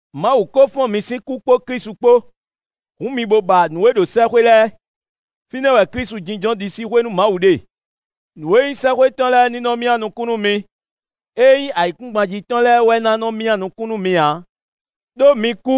Mawu kó fɔ́n mi sín kú kpó Klísu kpó. Hǔn mi bo ba nǔ e ɖo sɛ́xwé lɛ́ɛ; fínɛ́ wɛ Klísu jínjɔ́n ɖisíxwé nú Mawu ɖe. Nǔ e nyí sɛ́xwé tɔn lɛ́ɛ ní nɔ́ myá nukún nú mi; ée nyí ayǐkúngban jí tɔn lɛ́ɛ wɛ ná nɔ myá nukún nú mi ǎ. Đó mi kú,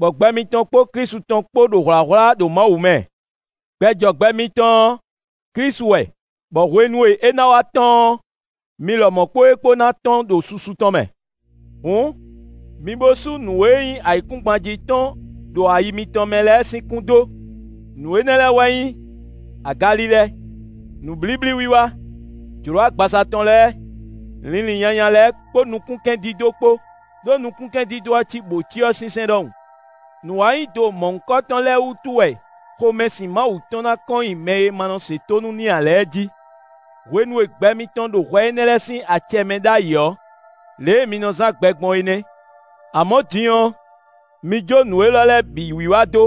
bɔ gbɛ mitɔn kpó Klísu tɔn kpó ɖo hwlǎhwlá ɖo Mawu mɛ. Gbɛ jɔ gbɛ mitɔn ɔ́, Klísu wɛ, bɔ hwenu e é ná wá tɔ́n ɔ́, mi lɔmɔ̌ kpó é kpó ná tɔ́n ɖo susu tɔn mɛ. Hǔn, mi bo sú nǔ e nyí ayǐkúngban jí tɔn ɖo ayi mitɔn mɛ lɛ́ɛ sín kún dó; nǔ énɛ́ lɛ́ɛ wɛ nyí: agalilɛ, nǔblíblíwiwa, jlǒ agbaza tɔn lɛ́ɛ, linlin nyanya lɛ́ɛ kpó nukúnkɛndídó kpó, ɖó nukúnkɛndídó ɔ́ cí bǒcyɔ sinsɛn ɖɔhun. Nǔwanyido mɔ̌hunkɔtɔn lɛ́ɛ wútu wɛ xomɛsin Mawu tɔn ná kɔn nyi mɛ e ma nɔ se tónú n'i ǎ lɛ́ɛ jí. Hwenu e gbɛ mitɔn ɖo hwɛ énɛ́ lɛ́ɛ sín acɛ mɛ ɖ'ayǐ ɔ́, lě e mi nɔ zán gbɛ gbɔn é nɛ́. Amɔ̌ din ɔ́, mi jó nǔ élɔ́ lɛ́ɛ bǐ wiwa dó: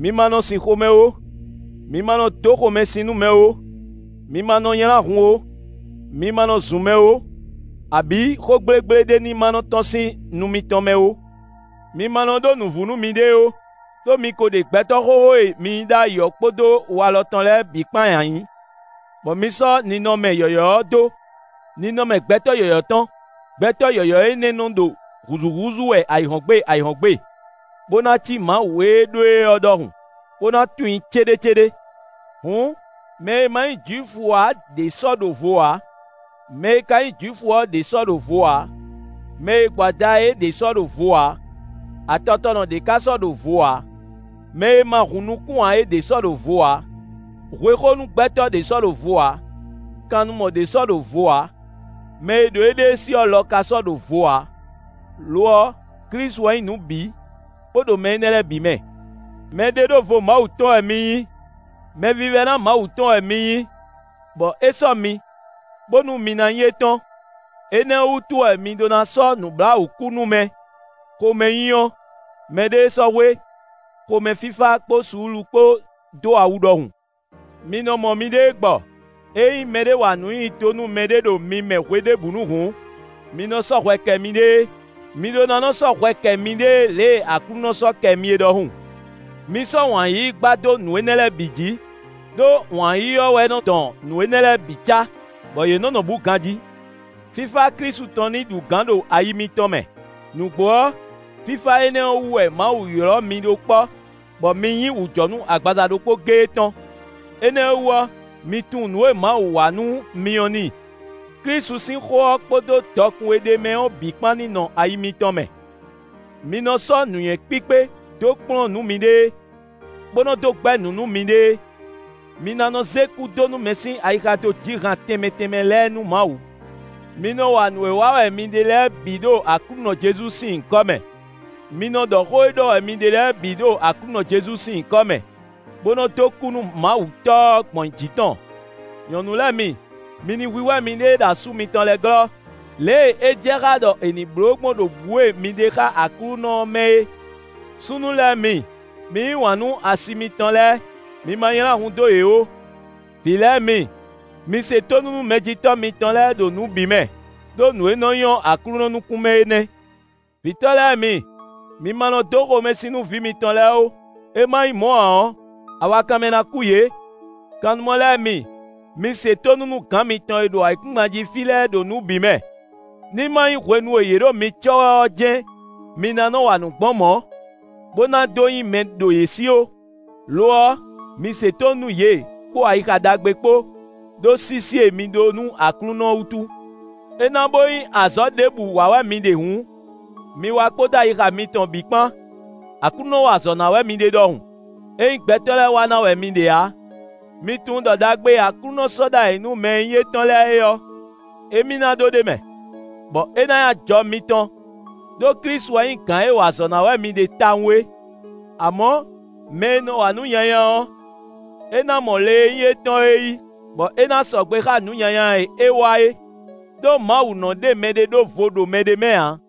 mi ma nɔ sin xomɛ ó; mi ma nɔ dó xomɛsin nú mɛ ó; mi ma nɔ nylá hun ó; mi ma nɔ zun mɛ ó, abǐ xó gblégblé ɖé ní ma nɔ tɔ́n sín nu mitɔn mɛ ó. Mi ma nɔ ɖó nǔvú nú miɖée ó, ɖó mi ko ɖe gbɛtɔ́ xóxó e mi nyí ɖ'ayǐ ɔ́ kpódó walɔ tɔn lɛ́ɛ bǐ kpán nyi ayǐ; bɔ mi sɔ́ ninɔmɛ yɔ̌yɔ́ ɔ́ dó; ninɔmɛ gbɛtɔ́ yɔ̌yɔ́ tɔn; gbɛtɔ́ yɔ̌yɔ́ énɛ́ nɔ ɖo hǔzúhúzú wɛ ayǐhɔ́ngbe ayǐhɔ́ngbe, bó ná cí Mawu e ɖó e ɔ́ ɖɔhun, bó ná tunwun i céɖécéɖé. Hǔn, mɛ e ma nyí Jwifu ǎ ɖě sɔ́ ɖo vo ǎ; mɛ e ka nyí Jwifu ɔ́ ɖě sɔ́ ɖo vo ǎ; mɛ e gbo ada é ɖě sɔ́ ɖo vo ǎ; atɔtɔnɔ ɖě ka sɔ́ ɖo vo ǎ; mɛ e ma hun nukún ǎ ɖě sɔ́ ɖo vo ǎ; hwexónu gbɛtɔ́ ɖě sɔ́ ɖo vo ǎ; kannumɔ ɖě sɔ́ ɖo vo ǎ; mɛ e ɖo éɖée sí ɔ́ lɔ ka sɔ́ ɖo vo ǎ; lo ɔ́, Klísu wɛ nyí nǔ bǐ, bó ɖo mɛ énɛ́ lɛ́ɛ bǐ mɛ. Mɛɖeɖóvo Mawu tɔn wɛ mi nyí. Mɛvívɛ́ná Mawu tɔn wɛ mi nyí, bɔ é sɔ́ mi, bónú mi ná nyí étɔn. Énɛ́ ɔ́ wútu wɛ mi ɖó ná sɔ́ nǔbláwǔkúnúmɛ, xomɛnyínyɔ́, mɛɖéesɔ́hwe, xomɛfífá kpó suúlu kpó dó awu ɖɔhun. Mi nɔ mɔ miɖée gbɔ; ényí mɛɖé wa nǔ nyi do nú mɛɖé ɖo mi mɛ hweɖěbǔnu hǔn, mi nɔ sɔ́ kɛ miɖée. Mi ɖó ná nɔ sɔ́ hwɛ kɛ miɖée lě e Aklúnɔ sɔ́ kɛ mi é ɖɔhun. Mi sɔ́ wǎn yíyí gbá dó nǔ énɛ́ lɛ́ɛ bǐ jí; ɖó wǎn yíyí ɔ́ wɛ nɔ dɔn nǔ énɛ́ lɛ́ɛ bǐ cá, bɔ yě nɔ́ nɔ bǔ ganjí. Fífá Klísu tɔn ní ɖu gǎn ɖo ayi mitɔn mɛ; nǔgbó ɔ́, fífá énɛ́ ɔ́ wú wɛ Mawu ylɔ́ mi ɖó kpɔ́, bɔ mi nyí wǔjɔnú agbaza ɖokpó géé tɔn. Énɛ́ ɔ́ wú ɔ́, mi tunwun nǔ e Mawu wa nú mi ɔ́ n'i. Klísu sín xó ɔ́ kpódó dɔkun e ɖ'é mɛ ɔ́ bǐ kpán ní nɔ ayi mitɔn mɛ. Mi nɔ sɔ́ nǔnywɛ́ kpíkpé dó kplɔ́n nǔ miɖée, bó nɔ dó gbɛ́ nǔ nú miɖée. Mi ná nɔ zé kúdónúmɛ sín ayixa dó ji han tɛnmɛ tɛnmɛ lɛ́ɛ nú Mawu. Mi nɔ wa nǔ e wa wɛ mi ɖe lɛ́ɛ bǐ ɖo Aklúnɔ Jezu sín nyǐkɔ mɛ; mi nɔ ɖɔ xó e ɖɔ wɛ mi lɛ́ɛ bǐ ɖo Aklúnɔ Jezu sín nyǐkɔ mɛ, bó nɔ dó kú nú Mawu Tɔ́ ɔ́ gbɔn jǐ tɔn. Nyɔ̌nu lɛ́ɛ mi, mi ní hwíhwɛ́ miɖée ɖo asú mitɔn lɛ́ɛ glɔ́, lě e é jɛ xá ɖɔ è nǐ bló gbɔn ɖo bǔ e mi ɖe xá Aklúnɔ ɔ́ mɛ é. Súnnu lɛ́ɛ mi, mi yí wǎn nú asi mitɔn lɛ́ɛ; mi ma nylá hun dó yě ó. Vǐ lɛ́ɛ mi, mi se tónú nú mɛjitɔ́ mitɔn lɛ́ɛ ɖo nǔ bǐ mɛ, ɖó nǔ e nɔ nyɔ́ Aklúnɔ nukún mɛ é nɛ́. Vǐtɔ́ lɛ́ɛ mi, mi ma nɔ dó xomɛsin nú vǐ mitɔn lɛ́ɛ ó; é ma nyí mɔ̌ ǎ ɔ́, awakanmɛ ná kú yě. Kannumɔ lɛ́ɛ mi, mi se tónú nú gǎn mitɔn e ɖo ayǐkúngban jí fí lɛ́ɛ ɖo nǔ bǐ mɛ; ní ma nyí hwenu e yě ɖo mi cɔ́ wɛ ɔ́ jɛ́n mi ná nɔ wa nǔ gbɔn mɔ̌, bó ná dó nyí mɛ ɖo yě sí ó; lo ɔ́, mi se tónú nú yě, kpó ayixa ɖagbe kpó, ɖó sísí e mi ɖó nú Aklúnɔ ɔ́ wútu. É ná bó nyí azɔ̌ ɖěbǔ wa wɛ mi ɖe hǔn, mi wa kpódó ayixa mitɔn bǐ kpán, Aklúnɔ wa azɔ̌ ná wɛ mi ɖe ɖɔhun; é nyí gbɛtɔ́ lɛ́ɛ wa ná wɛ mi ɖe ǎ. Mi tunwun ɖɔ ɖagbe e Aklúnɔ sɔ́ ɖ'ayǐ nú mɛ e nyí étɔn lɛ́ɛ é ɔ́, émí ná ɖó ɖ'é mɛ, bɔ é ná nyí ajɔ mitɔn; ɖó Klísu wɛ nyí gǎn e wa azɔ̌ ná wɛ mi ɖe tawun é. Amɔ̌, mɛ e nɔ wa nǔ nyanya ɔ́, é ná mɔ le e nyí étɔn ɔ́ yí, bɔ é ná sɔgbe xá nǔ nyanya e é wa é, ɖó Mawu nɔ́ ɖe mɛɖé ɖó vo ɖo mɛɖé mɛ ǎ.